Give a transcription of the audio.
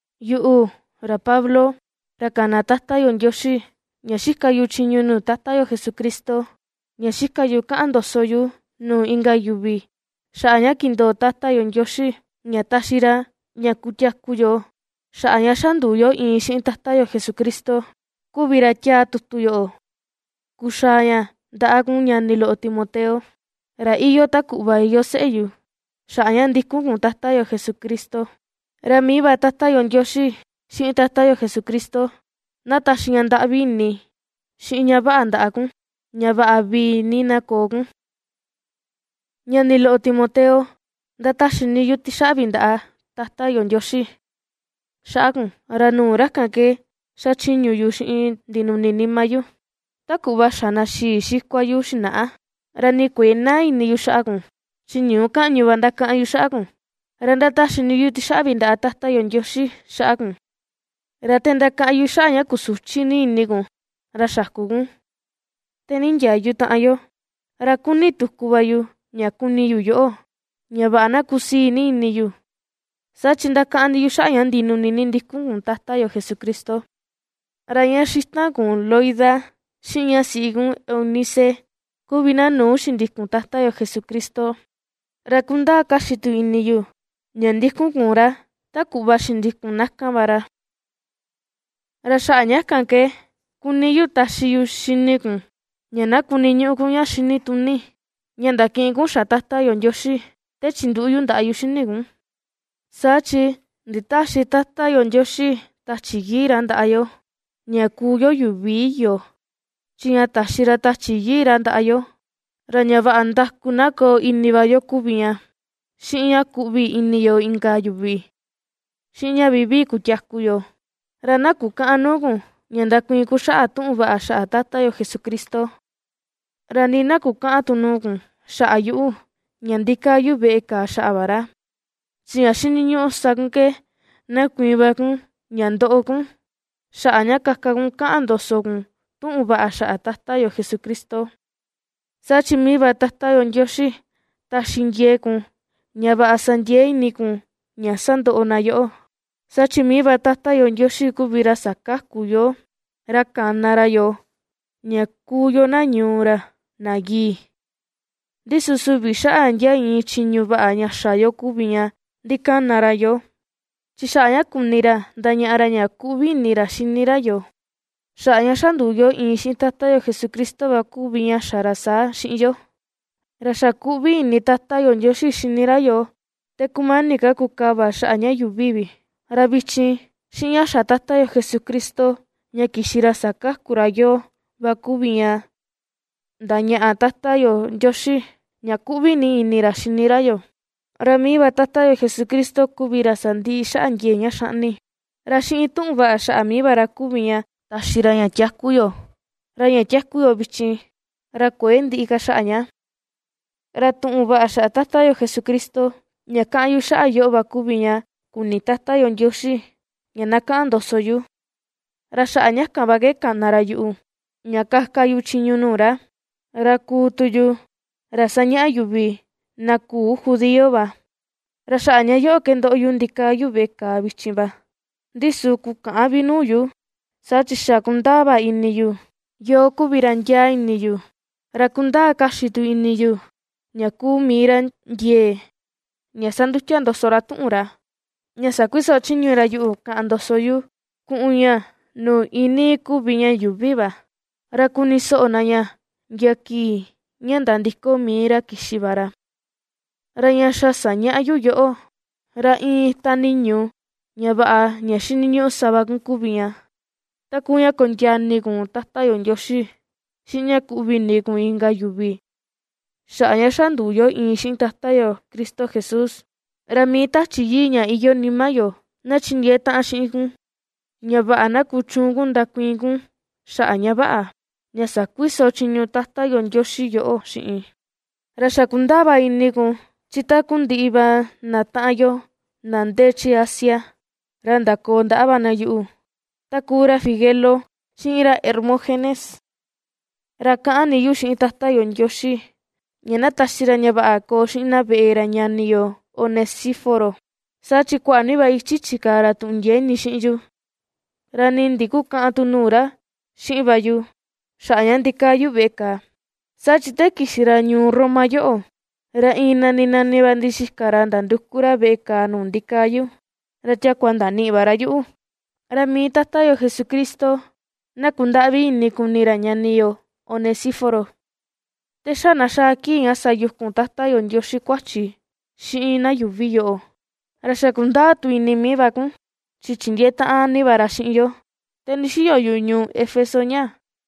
Yuꞌu, ra Pablo, ra kana Tata yo Ndioxi, ña xika yu chiñu yu nuu Tata yo Jesucristo, ña xika yu kaꞌan ndoso yu nuu inka yuvi xaꞌa ña kindoo Tata yo Ndioxi ña taxi ra ña kutiaku yo xaꞌa ña xa nduu yo iin xiꞌin Tata yo Jesucristo kuvi ra tiaa tutu yoꞌo, kuxaa ña ndaꞌa kun ñani loꞌo Timoteo, ra iyoo ta kuꞌva iyoo seꞌe yu, xaꞌa ña ndikun kun Tata yo Jesucristo. Ra mii va Tata yo Ndioxi, xiꞌin Tata yo Jesucristo na taxi ña ndaꞌvi ini, xiꞌin ña vaꞌa ndaꞌa kun, ña vaꞌa vii ni na koo kun. Ñani loꞌo Timoteo, ^ndataxi ni yu tixaꞌvi ndaꞌa Tata yo Ndioxi xaꞌa kun, ra nuu ra kan ke xachiñu yu xiꞌin ndinuni nima yu, ta kuꞌva xa na xii xikua yu xinaꞌa. Ra ni kuëe naa ini yu xaꞌa kun chi ñuu kaꞌñu va ndakaꞌan yu xaꞌa kun, ra ndataxi ni yu tixaꞌvi ndaꞌa Tata yo Ndioxi xaꞌa kun. Ra te ndakaꞌan yu xaꞌa ña kusuchi ni ini kun, ra xaku kun, te nindiayu taꞌan yo, ra ^kuni tuku va yu ña kuni yu yoꞌo ña vaꞌa na kusii ni ini yu. Saa chi ndakaꞌan ni yu xaꞌa ña ndinuni ni ndikun kun Tata yo Jesucristo. Ra ña xitan kun Loida, xiꞌin ña siꞌi kun Eunice kuvi na nuu xindikun Tata yo Jesucristo, ra kundaa kaxi tu ini yu ña ndikun kun ra ta kuꞌva xindikun na kan va ra. Ra xaꞌa ña kan ke kuni yu taxi yu xini kun, ña na kuniñuꞌu kun ña xinituni ña ndakiꞌin kun xa Tata yo Ndioxi, te chinduꞌu yu ndaꞌa yu xini kun. Saa chi nditäxi Tata yo Ndioxi Tachi Yii ra ndaꞌa yo ña kuu yo yuvi iyo, chi ña taxi ra Tachi Yii ra ndaꞌa yo, ra ña vaꞌa ndaku na koo ini va yo kuvi ña, xiꞌin ña kuꞌvi ini yo inka yuvi, xiꞌin ña vivii kutiaku yo. Ra na kukäꞌan nuu kun ña ndakuiin kun xaꞌa tuꞌun vaꞌa xaꞌa Tata yo Jesucristo, ra nii na kukäꞌan tu nuu kun xaꞌa yuꞌu ña ndikaa yu veꞌe kàà xaꞌa va ra. Chi ña xiniñuꞌu sa kun ke na kuiin va kun ña ndoꞌo kun, xaꞌa ña kaka kun kaꞌan ndoso kun tuꞌun vaꞌa xaꞌa Tata yo Jesucristo. Saa chi mii va Tata yo Ndioxi taxi ndiee kun ña vaꞌa sa ndiee ini kun ña sandoꞌo na yoꞌo. Saa chi mii va Tata yo Ndioxi kuvi ra sakaku yoo, ra kana ra yoo ña kuu yo na ñuu ra na yii, ndi su süvi xaꞌa ndia iin chiñu vaꞌa ña xa yo kuvi ña ndikana ra yoo. Chi xaꞌa ña kuni ra ndañaꞌa ra ña kuꞌvi ini ra xini ra yoo, xaꞌa ña xa nduu yo iin xiꞌin Tata yo Jesucristo va kuvi ña xa ra saa xiꞌin yo. Ra xa kuꞌvi ini Tata yo Ndioxi xini yoo te kumani ka kukava xaꞌa ña yuuvi vi. Ra vichin, xiꞌin ña xa Tata yo Jesucristo ña kixi ra sakaku ra yoo va kuvi ña ndañaꞌa Tata yo Ndioxi ña ^kuꞌvi ni ini ra xini ra yoo. Ra mii va Tata yo Jesucristo kuvi ra sandiꞌi xaꞌa ndiee ña xaꞌni, ra xiꞌin tuꞌun vaꞌa xaꞌa mii va ra kuvi ña taxi ra ña tiaku yo, ra ña ^tiaku yo vichin, ra kuëe ndiꞌi ka xaꞌa ña. Ra tuꞌun vaꞌa xaꞌa Tata yo Jesucristo, ña kaꞌan yu xaꞌa yoꞌo va kuvi ña kuni Tata yo Ndioxi ña na kaꞌan ndoso yu, ra xaꞌa ña kan va ke kana ra yuꞌu, ña kaka yu chiñu nuu ra, ra kuu tu yu, ra sañaꞌa yuvi na küu judío va. Ra xaꞌa ña yoꞌo ke ndoꞌo yu ña ndikaa yu veꞌe kàà vichin va, ndi su kukäꞌan vi nuu yu, saa chi xa kundaa va ini yu yoo kuvi ra ndiaa ini yu, ra kundaa kaxi tu ini yu ña kuu mii ra ndiee ña sandutia ndoso ra tuꞌun ra ña sakuiso chiñu ra yuꞌu kaꞌan ndoso yu kuꞌun ña nuu iinii kuvi ña yuuvi va, ra kuni soꞌo na ña ndia kii ña nandiko mii ra kixi va ra. Ra ña xa sañaꞌa yu yoꞌo, ra iin ita niñu ña vaꞌa ña xiniñuꞌu sa va kun kuvi ña, ta kuu ña kondiaa ini kun Tata yo Ndioxi, xiꞌin ña kuꞌvi ini kun inka yuvi xaꞌa ña xa nduu yo iin xiꞌin Tata yo Cristo Jesús. Ra mii Tachi Yii ña iyoo nima yo, na chindiee taꞌan xiꞌin kun ña vaꞌa na kuchuun kun ndakuiin kun xaꞌa ña vaꞌa, ña sakuiso chiñu Tata yo Ndioxi yoꞌo xiꞌin. Ra xa kundaa va ini kun, chi takundiꞌi va na taꞌan yo na ndee chi Asia, ra ndakoo ndaꞌa va na yuꞌu; ta kuu ra Figelo, xiꞌin ra Hermógenes. Ra kaꞌan ni yu xiꞌin Tata yo Ndioxi ña na taxi ra ña vaꞌa koo xiꞌin na veꞌe ra ñani yo Onesíforo, saa chi kuaꞌa ni va ichi chikaa ra tuꞌun ndiee ini xiꞌin yu, ra nii ndikukäꞌan tu nuu ra xiꞌin va yu xaꞌa ña ndikaa yu veꞌe kàà. Saa chi te kixi ra ñuu Roma yoꞌo ra iin nani nani va ndixika ra nanduku ra veꞌe kàà nuu ndikaa yu, ra ndiakua ndaniꞌi va ra yuꞌu. Ra mii Tata yo Jesucristo na kundaꞌvi ini kuni ra ñani yo, Onesíforo, te xa na xaa kii ña sayukun Tata yo Ndioxi kuachi xiꞌin na yuuvi yoꞌo. Ra xa kundaa tu ini mii va kun, chi chindiee taꞌan ni va ra xiꞌin yo te ndixiyo yu ñuu Éfeso ñaa.